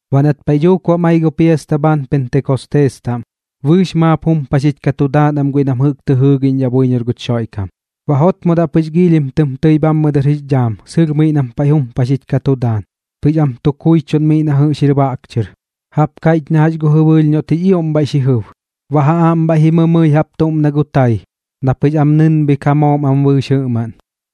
Baꞌ nat paiꞌ dhuuk bam ai gu piasta bhaan Pentekostees taꞌm, bɨɨx maap jumpaxich ka tu daan am guiꞌ nam jɨꞌk tɨ jɨɨgiꞌñdhaꞌ buiñor guch Xoiꞌkam. Baꞌ jotmodaꞌ pɨx giilhim tɨm tɨi bhammɨ dɨr jix dhaam sɨlh miꞌ nam paiꞌ jumpaxich ka tu daan, pɨx am tu kuichuꞌn miꞌ na jɨꞌx jir baꞌk chɨr, jaꞌp kaiꞌch na jax gu jɨbɨɨlh noꞌt jix ioꞌm bhaiꞌ xi jɨb. Baꞌ ja aꞌm bhaiꞌ ji mɨmɨi jaꞌp tuꞌm na gu tai, na pɨx am nɨnbhik ja moom am bɨɨx jɨꞌmaꞌn,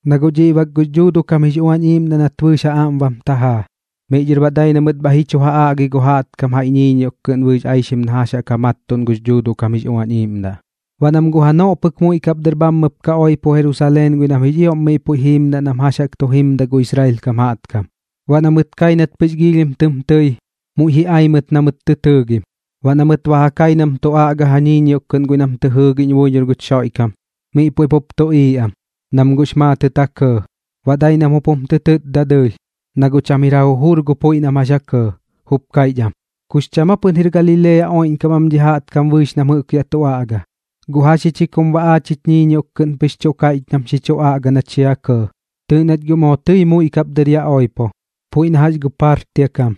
na guꞌ dhiꞌ bak gux Dhuuduꞌ kam jix Uañ Iiꞌmdaꞌ nat bɨɨx ja aꞌm bam tajaa. Miꞌ dhɨr baꞌ dai na mɨt bhaiꞌ ji chu ja aꞌgi gu jaꞌtkam jaiꞌ ñiiñioꞌk kɨꞌn bɨɨx aixim na jax jaꞌk ja mattuꞌn gux Dhuuduꞌ kam jix Uañ Iiꞌmdaꞌ. Baꞌ nam guꞌ janoꞌ pɨk muiꞌ kap dɨr bhammɨp ka oipo Jerusaleen guiꞌ nam jix ioꞌm miꞌ puiꞌ jiimdaꞌ nam jax jaꞌk tu jimdaꞌ gu Israel kam jaꞌtkam. Baꞌ na mɨt kai nat pɨx giilhim tɨm tɨi, muiꞌ ji ai mɨt na mɨt tɨ tɨɨgim. Baꞌ na mɨt ba ja kai nam tu aꞌga ja ñiiñioꞌk kɨꞌn guiꞌ nam tɨ jɨɨgiꞌñ buiñor guch Xoiꞌkam, miꞌ puiꞌ pup tuꞌiiꞌ am, nam guꞌx maatɨt ja kɇɇ. Baꞌ dai nam jup jum tɨ tɨtda dɨɨlh, na guꞌ cham jir ja jujur gu puiꞌ nam jax ja kɇɇ, jup kaiꞌch am: ―¿Kux cham aa pɨn jir Galilea oiꞌñkam am dhi jaꞌtkam bɨɨx nam jɨꞌk yaꞌ tu aꞌga? ¿Guꞌ jax ji chi kum baꞌ aach jich ñiiñioꞌk kɨꞌn pɨx chuꞌ kaiꞌch nam xi chu aꞌga nach xi ja kɇɇ? Tɨɨꞌ nach guꞌ moo tɨi muiꞌ kap dɨr yaꞌ oipo, puiꞌ na jax gu Partia kam,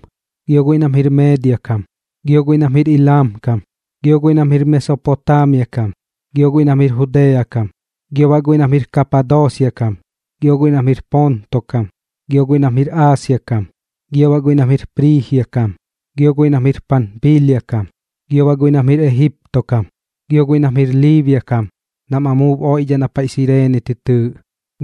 gio guiꞌ nam jir Meedia kam, gio guiꞌ nam jir Ilam kam, gio guiꞌ nam jir Mesopotaamia kam, gio guiꞌ nam jir Judea kam, gio baꞌ guiꞌ nam jir Kapadoosia kam, gio guiꞌ nam jir Ponto kam, gio guiꞌ nam jir Aasia kam, gio baꞌ guiꞌ nam jir Priijia kam, gio guiꞌ nam jir Panpiilia kam, gio baꞌ guiꞌ nam jir Ejipto kam, gio guiꞌ nam jir Liibia kam nam amuub oiꞌdhaꞌ na paiꞌ Sireene tɨ tɨɨꞌ,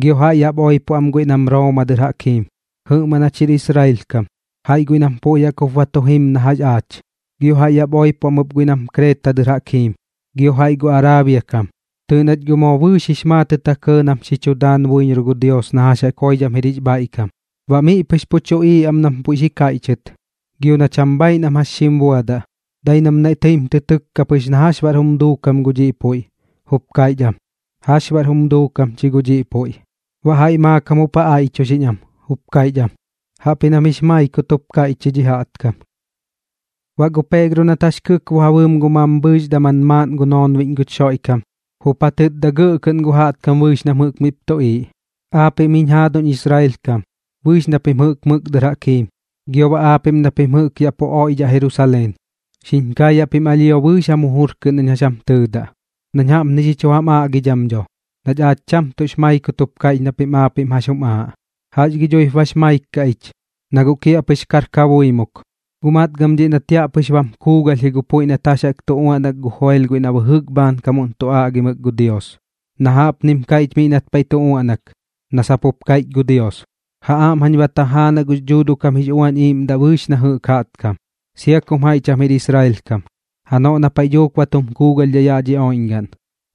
gio jaiꞌ yaꞌp oipo am ɨp guiꞌ nam Rooma dɨr jaꞌk jiim. Jɨꞌmaꞌn jach jir Israel kam, jaiꞌ guiꞌ nam puiꞌ jaꞌk jup ba tu jim na jax aach. Gio jaiꞌ yaꞌp oipo am ɨp guiꞌ nam Kreeta dɨr jaꞌk jim, gio jaiꞌ gu Araabia kam. Tɨɨꞌ nach guꞌ moo bɨɨx jix maatɨt ja kɇɇ nam xi chu daan buiñor gu Dios na jax jaꞌk joidham jir jix bhaiꞌkam. Baꞌ miꞌ pɨx pu tuꞌiiꞌ am nam puiꞌ xi kaiꞌchɨt, gio na cham bhaiꞌ nam jax xim buadaꞌ. Dai nam naiꞌ tɨim tɨ tɨkka pɨx na jax baꞌr jum duukam gu dhiꞌ puiꞌ, jup kaiꞌch am: ―¿Jax baꞌr jum duukam chi gu dhiꞌ puiꞌ? Baꞌ jaiꞌ maakam jup ja aiꞌchuxiꞌñ am, jup kaiꞌch am: ―Jaꞌpji nam jix maikut jup kaiꞌch ji dhi jaꞌtkam. Baꞌ gu Peegro nat jax kɨkbo ja bɨɨm gu mambhɨɨx daman maaꞌn noonbiꞌñ guch Xoiꞌkam, jup ja tɨtda gɇꞌ kɨꞌn gu jaꞌtkam bɨɨx nam jɨꞌk miꞌp tuꞌiiꞌ: ―Aapiꞌm jiñ jaaduñ Israel kam bɨɨx na pim jɨꞌk mɨk dɨr jaꞌk jiim, gio baꞌ aapiꞌm na pim jɨꞌk yaꞌ pu oiꞌdhaꞌ Jerusaleen, xiñ kaayaꞌ pim alhio bɨɨx jam jujur kɨꞌn nañ jax jam tɨɨdaꞌ, nañ jaꞌpni xi chu jam aꞌgidham dho nach aach cham tuꞌx maikut jup kaiꞌch na pim aapiꞌm jax jum aaꞌ. ¿Jax gi dhuip bax maik kaꞌ ich, na guꞌ kiaꞌpɨx kar kabuimuk? Guꞌ matgɨm dhiꞌ nat yaꞌ pɨx puiꞌ bam kuugalh ji gu puiꞌ nat jax jaꞌk tu uaꞌnak gu Joel guiꞌ na bɨjɨk bhaankamuꞌn tu aꞌgimɨk gu Dios, na jaꞌpnim kaiꞌch miꞌ nat paiꞌ tu uaꞌnak na sap jup kaiꞌch gu Dios: Ja aꞌm jañ ba tajaanaꞌ gux Dhuuduꞌ kam jix Uañ Iiꞌmdaꞌ bɨɨx na jɨꞌk jaꞌtkam, sia kum jaiꞌ cham jir Israel kam, janoꞌ na paiꞌ dhuuk ba tum kuugalhdhidhaꞌ yaꞌ dhi oiꞌñgaꞌn.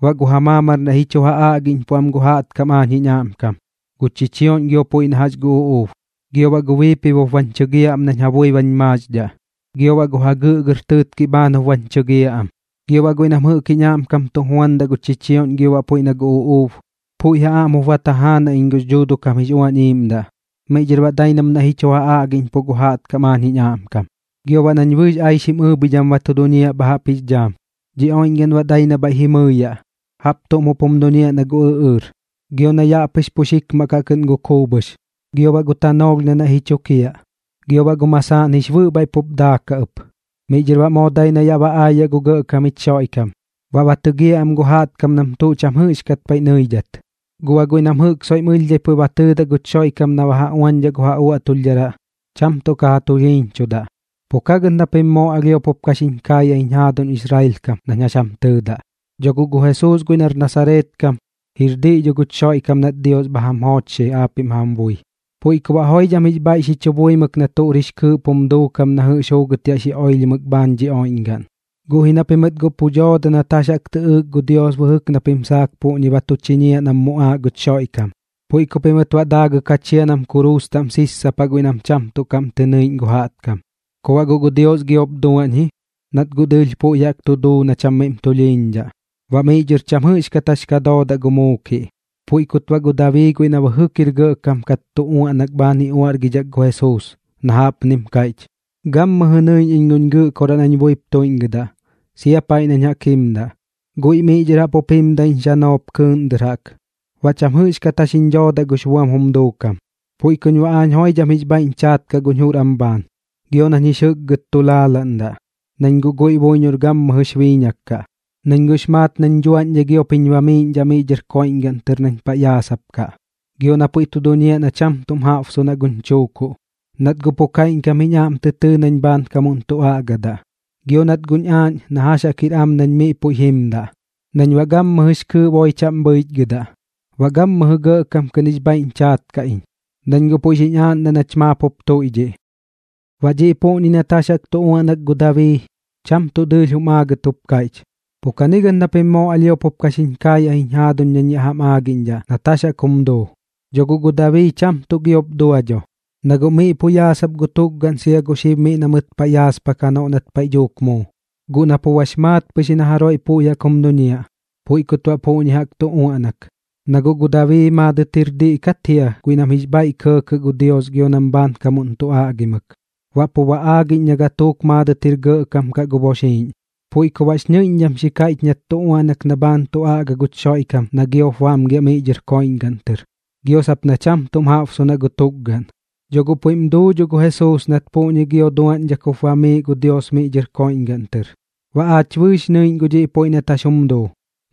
Baꞌ gu ja maamar naiꞌ ji chu ja aꞌgiꞌñpuꞌ am gu jaꞌtkam aañ jiñ aꞌmkam, gu chichioꞌñ gio puiꞌ na jax gu uꞌuub, gio baꞌ gu biipibop bañ chɨgiaꞌ am nañ ja bui bañ maaxdhaꞌ, gio baꞌ gu jagɨꞌgɨr tɨɨtkiꞌ bhaan jup bañ chɨgiaꞌ am. Gio baꞌ guiꞌ nam jɨꞌk jiñ aꞌmkam tu juandaꞌ gu chichioꞌñ gio puiꞌ na gu uꞌuub, puiꞌ ja aꞌm jup ba tajaanaꞌ iñ gux Dhuuduꞌ kam jix Uañ Iiꞌmdaꞌ, miꞌ dhɨr baꞌ dai nam naiꞌ ji chu ja aꞌgiꞌñpuꞌ gu jaꞌtkam aañ jiñ aꞌmkam. Gio baꞌ nañ bɨɨx aixim ɨɨbhidham ba tu duñiaꞌ bha jaꞌp jix dhaam, dhi oiꞌñgaꞌn baꞌ dai na bhaiꞌ ji mɨɨyaꞌ, jaꞌp tuꞌm jup jum duñiaꞌ na gu ɨꞌɨɨr, gio na yaꞌ pɨx pux jikmaꞌ kaꞌ kɨꞌn gu kuubhɨx. Gio baꞌ gu tanoolh na naiꞌ ji chukiaꞌ, gio baꞌ gu masaaꞌn jix bɨꞌ bhaiꞌ pup daakaꞌ ɨp. Miꞌ dhɨr baꞌ moo dai na yaꞌ ba aayaꞌ gu Gɇꞌkam jich Xoiꞌkam. Baꞌ ba tɨgiaꞌ am gu jaꞌtkam nam tuꞌ cham jɨꞌxkat paiꞌ nɨidhat. Gu baꞌ guiꞌ nam jɨꞌk soiꞌm ɨlhdhai puiꞌ ba tɨɨdaꞌ guch Xoiꞌkam na ba ja uañchudaꞌ gu ja uaꞌtulhdharaꞌ, cham tuꞌ ka ja tulhiiñchudaꞌ. ’Pu kagɨt na pim moo alhio kapup xiñ kaayaꞌ jiñ jaaduñ Israel kam nañ jax jam tɨɨdaꞌ. Dho guꞌ gu Jesuus guiꞌ nar Nasareet kam, jir diꞌ dho guch Xoiꞌkam nat Dios bha jam joochxi aapiꞌm jam bui. Puiꞌ ku baꞌ joidham jix bhaiꞌ xi chu buimɨk na tuꞌr jix kɨɨꞌp jum duukam na jɨꞌx juugɨt yaꞌ xi oilhimɨk bhaan dhi oiꞌñgaꞌn. Guꞌ ji na pimɨt guꞌ pu dooda nat jax jaꞌk tɨꞌɨɨk gu Dios bɨjɨk na pim saak puꞌñi ba tu chiñiaꞌ nam muꞌaaꞌ guch Xoiꞌkam. Puiꞌ ku pimɨt baꞌ daagɨk ja chia nam kuruus taꞌm sissapaꞌ guiꞌ nam cham tuꞌ kaꞌm tɨ nɨiꞌñ gu jaꞌtkam. Ku baꞌ guꞌ gu Dios giop duaꞌñ ji, nat guꞌ dɨɨlh puiꞌ jaꞌk tu duu na cham miꞌm tulhiiñdhaꞌ, baꞌ miꞌ dhɨr cham jɨꞌxkat jax ka doodaꞌ gu muukiꞌ. Puiꞌ kut baꞌ gu Dabii guiꞌ na bɨjɨk jir gɇꞌkam kat tu uaꞌnak bhaan ji uaꞌrgidhat gu Jesuus, na jaꞌpnim kaiꞌch: Gammɨjɨ nɨiꞌñ iñ guñ Gɨꞌkoraꞌ nañ buip tuiꞌñgɨdaꞌ, sia paiꞌ nañ jaꞌk jimdaꞌ. Guiꞌ miꞌ dhɨr jaꞌp jup jimdaꞌ jiñ xanoop kɨɨꞌn dɨr jaꞌk, baꞌ cham jɨꞌxkat jax jiñ dhoodaꞌ gux buam jum duukam. Puiꞌ kuñ baꞌ aañ joidham jix bhaiꞌñ chaat kaꞌ guñ jur am bhaan, gio nañ jix jɨkgɨt tu laalaꞌndaꞌ, nañ guꞌ guiꞌ buiñor gammɨjɨx biiñak kaꞌ. Nañ guꞌx maat nañ dhuaꞌñdhai giop jiñ bamiiꞌñdhaꞌ miꞌ dhɨr koiꞌñgaꞌn tɨr nañ paiꞌ yaasapkaꞌ, gio na puiꞌ tu duñiaꞌ na cham tuꞌm jaꞌbsunaꞌ guñ chuukuꞌ, nat guꞌ pu kaiꞌñkam jiñ aꞌm tɨ tɨɨ nañ bhaankamuꞌn tu aꞌgadaꞌ. Gio nat guꞌñ aaꞌñ na jax jaꞌk jir am nañ miꞌ puiꞌ jimdaꞌ nañ baꞌ gammɨjɨx kɨɨꞌ boi chaꞌm bhɨichgɨdaꞌ, baꞌ gammɨjɨ gɇꞌkam kɨꞌn jix bhaiꞌñ chaat kaꞌ iñ, nañ guꞌ puiꞌ xiñ aaꞌndaꞌ nach maap jup tuiꞌdhiꞌ. ’Baꞌ dhiꞌ puꞌñi nat jax jaꞌk tu uaꞌnak gu Dabii, cham tuꞌ dɨɨlh jum aagɨt jup kaiꞌch. Pu kagɨt na pim moo alhio ka pup xiñ kaayaꞌ jiñ jaaduñ nañ yaꞌ jam aagiꞌñdhaꞌ nat jax jaꞌk jum duu. Dho guꞌ gu Dabii cham tuꞌ giop dua dho, na guꞌ miꞌ pu yaasap gu tukgaꞌn sia gu xib miꞌ na mɨt paiꞌ yaaspak janoꞌ nat paiꞌ dhuuk muu. Guꞌ na pu bax maat pɨx ji na jaroiꞌ puiꞌ jaꞌk jum duñiaꞌ, puiꞌ kut baꞌ puꞌñi jaꞌk tu uaꞌnak, na guꞌ gu Dabii maadɨt jir diꞌ kat jia guiꞌ nam jix bhaiꞌ kɇɇkɇt gu Dios gio nam bhaankamuꞌn tu aꞌgimɨk, baꞌ pu ba aagiꞌñ na gatuuk maaꞌn jir gɇꞌkam kaꞌ gu boxiiꞌñ. Puiꞌ ku baꞌx ñɨiꞌñdham xi kaiꞌch nat tu uaꞌnak na bhaan tu aꞌga guch Xoiꞌkam na giop bamgiaꞌ miꞌ dhɨr koiꞌñgaꞌn tɨr, gio sap na cham tuꞌm jaꞌbsunaꞌ gu tukgaꞌn. Dho guꞌ puiꞌm duu dho gu Jesuus nat puꞌñi gio duaꞌñdhak jup bamiiꞌ gu Dios miꞌ dhɨr koiꞌñgaꞌn tɨr. Baꞌ aach bɨɨx nɨiꞌñ gu dhiꞌ puiꞌ nat jax jum duu.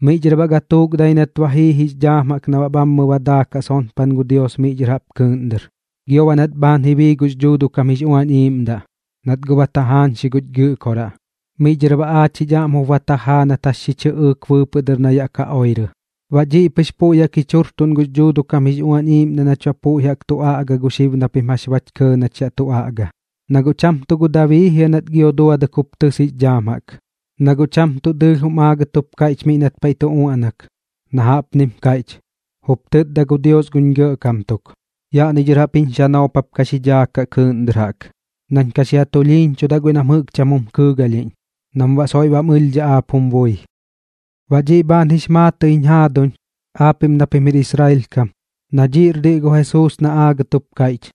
Miꞌ dhɨr baꞌ gatuuk dai nat ba jii jix dhaam jaꞌk na baꞌ bhammɨ ba daakaꞌ sonpan gu Dios miꞌ dhɨr jaꞌp kɨɨꞌn dɨr, gio baꞌ nat bhaan ji bii gux Dhuuduꞌ kam jix Uañ Iiꞌmdaꞌ, nat guꞌ ba tajaañxi guch Gɨꞌkoraꞌ. Miꞌ dhɨr baꞌ aach jich aꞌm jup ba tajaa nat jax xi chɨꞌɨɨk bɨɨpɨꞌ dɨr na yaꞌ ka oirɨ. Baꞌ dhiꞌ pɨx puiꞌ jaꞌk jich jujurtuꞌn gux Dhuuduꞌ kam jix Uañ Iiꞌmdaꞌ nach baꞌ puiꞌ jaꞌk tu aꞌga gu xib na pim jax bach kɇɇ nach yaꞌ tu aꞌga. Nat guꞌ cham tuꞌ gu Dabii jia nat gio duadɨk jup tɨs jix dhaam jaꞌk, na guꞌ cham tuꞌ dɨɨlh jum aagɨt jup kaiꞌch miꞌ nat paiꞌ tu uaꞌnak, na jaꞌpnim kaiꞌch: Jup tɨtda gu Dios guñ Gɇꞌkam tuk: “Yaꞌni dhɨr jaꞌp jiñ xanoop jap ka xi dhaakaꞌ kɨɨꞌn dɨr jaꞌk, nañ ka xi ja tulhiiñchudaꞌ guiꞌ nam jɨꞌk cham jum kɨɨgalhiꞌñ, nam baꞌ soiꞌ bam ɨlhdhaꞌ aap jum bui.” ’Baꞌ dhiꞌ bhaan jix maatɨꞌ jiñ jaaduñ aapiꞌm na pim jir Israel kam, na dhiꞌr diꞌ gu Jesuus na aagɨt jup kaiꞌch,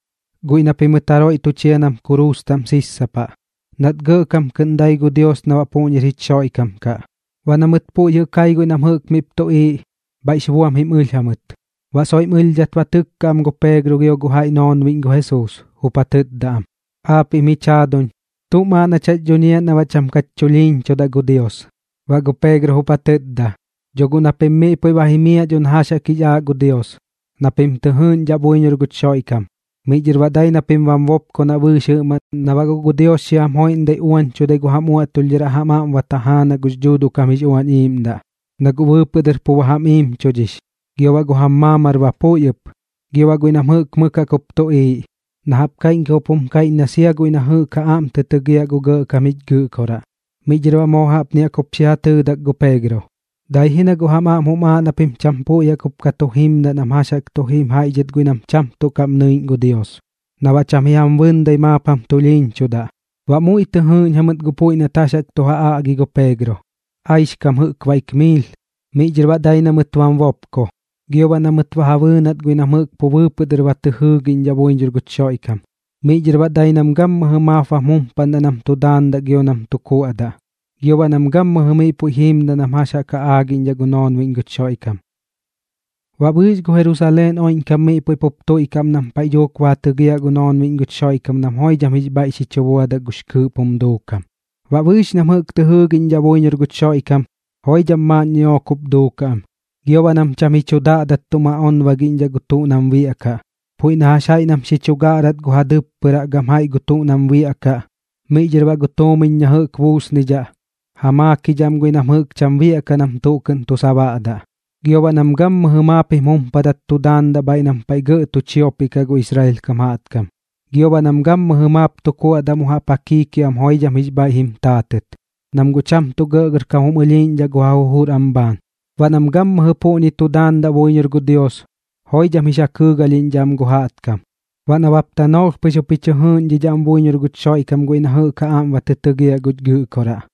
guiꞌ na pimɨt jaroiꞌ tu chia nam kuruus taꞌm sissapaꞌ, nat gɇꞌkam kɨꞌn dai gu Dios na baꞌ puꞌñir jich Xoiꞌkam kaꞌ. Baꞌ na mɨt puiꞌ jɨꞌ kai guiꞌ nam jɨꞌk miꞌp tuꞌiiꞌ, bhaiꞌx buam jim ɨlh jamɨt, baꞌ soiꞌm ɨlhdhat ba tɨkka am gu Peegro gio gu jaiꞌ noonbiꞌñ gu Jesuus, jup ja tɨtda am: ―Aapiꞌm jich jaaduñ, ¿tuꞌm aaꞌ nach jax dhuñiaꞌ na baꞌ cham kach chulhiiñchudaꞌ gu Dios? Baꞌ gu Peegro jup ja tɨtda: ―Dho guꞌ na pim miꞌ puiꞌ ba jimiaꞌ dho na jax jaꞌk jix aaꞌ gu Dios, na pim tɨ jɨɨꞌñdhaꞌ buiñor guch Xoiꞌkam. Miꞌ dhɨr baꞌ dai na pim bam bopkonaꞌ bɨɨx jɨꞌmaꞌn na baꞌ guꞌ gu Dios xi jam joiꞌmdai uañchudai gu jam uaꞌtulhdharaꞌ jam aꞌm ba tajaanaꞌ gux Dhuuduꞌ kam jix Uañ Iiꞌmdaꞌ. Na guꞌ bɨɨpɨꞌ dɨr pu ba jam iimchudhix, gio baꞌ gu jam maamar ba puiꞌ ɨp, gio baꞌ guiꞌ nam jɨꞌk mɨk jaꞌp jup tuꞌiiꞌ, na jaꞌp kaiꞌñkam jup jum kaiꞌch na sia guiꞌ na jɨꞌk ja aꞌm tɨ tɨgiaꞌ gu Gɇꞌkam jich Gɨꞌkoraꞌ. Miꞌ dhɨr baꞌ moo jaꞌpni jaꞌk jup xi ja tɨɨdak gu Peegro: ―Dai ji na guꞌ jam aꞌm jum aaꞌ na pim cham puiꞌ jaꞌk jup ka tu jimdaꞌ nam jax jaꞌk tu jim jaiꞌ dhɨt guiꞌ nam cham tuꞌ kaꞌm nɨiꞌñ gu Dios, na baꞌ cham ji jam bɨndai maap jam tulhiiñchudaꞌ. Baꞌ muiꞌ tɨ jɨɨꞌñ jamɨt gu puiꞌ nat jax jaꞌk tu ja aꞌgi gu Peegro, aixkam jɨꞌk baik miil. Miꞌ dhɨr baꞌ dai na mɨt bam bopko, gio baꞌ na mɨt ba ja bɨɨnat guiꞌ nam jɨꞌk pu bɨɨpɨꞌ dɨr ba tɨ jɨɨgiꞌñdhaꞌ buiñor guch Xoiꞌkam. Miꞌ dhɨr baꞌ dai nam gammɨjɨ maap bam jumpaꞌndaꞌ nam tu daandaꞌ gio nam tu kuaꞌdaꞌ, gio baꞌ nam gammɨjɨ miꞌ puiꞌ jiimdaꞌ nam jax jaꞌk ja aagiꞌñ gu noonbiꞌñ guch Xoiꞌkam. Baꞌ bɨɨx gu Jerusaleen oiꞌñkam miꞌ puiꞌ pup tuiꞌkaꞌ am nam paiꞌ dhuuk ba ja tɨgiaꞌ gu noonbiꞌñ guch Xoiꞌkam nam joidham jix bhaiꞌ xi chu buadaꞌ gux kɨɨꞌp jum duukam. Baꞌ bɨɨx nam jɨꞌk tɨ jɨɨgiꞌñdhaꞌ buiñor guch Xoiꞌkam, joidham maaꞌn ñiꞌook jup duukaꞌ am, gio baꞌ nam cham ji chu daꞌdat tum aꞌonbagiꞌñdhaꞌ gu tuꞌ nam biaꞌkaꞌ. Puiꞌ na jax jaiꞌ nam xi chu gaꞌrat gu ja dɨppɨraꞌ gam jaiꞌ gu tuꞌ nam biaꞌkaꞌ, miꞌ dhɨr baꞌ gu tuumiñ na jɨꞌk mi buusnidhaꞌ, ja maakidhaꞌ am guiꞌ nam jɨꞌk cham biaꞌkaꞌ nam tuꞌ kɨꞌn tu sabaꞌdaꞌ. Gio baꞌ nam gammɨjɨ maap jim jumpadat tu daandaꞌ bhaiꞌ nam paiꞌ gɇꞌ tu chiopiꞌ kaꞌ gu Israel kam jaꞌtkam, gio baꞌ nam gammɨjɨ maap tu kuaꞌdaꞌ mu jaꞌp ja kiikiaꞌam joidham jix bhaiꞌ jim taatɨt, nam guꞌ cham tuꞌ gɇꞌgɇrkam jum ɨlhiiꞌñdhaꞌ gu ja jujur am bhaan. Baꞌ nam gammɨjɨ puꞌñi tu daandaꞌ buiñor gu Dios, joidham jix ja kɨɨgalhiꞌñdhaꞌ am gu jaꞌtkam. Baꞌ nabap tanoolh pɨx jup ji chɨ jɨɨꞌñdhidhaꞌ am buiñor guch Xoiꞌkam guiꞌ na jɨꞌk ja aꞌm ba tɨ tɨgiaꞌ guch Gɨꞌkoraꞌ.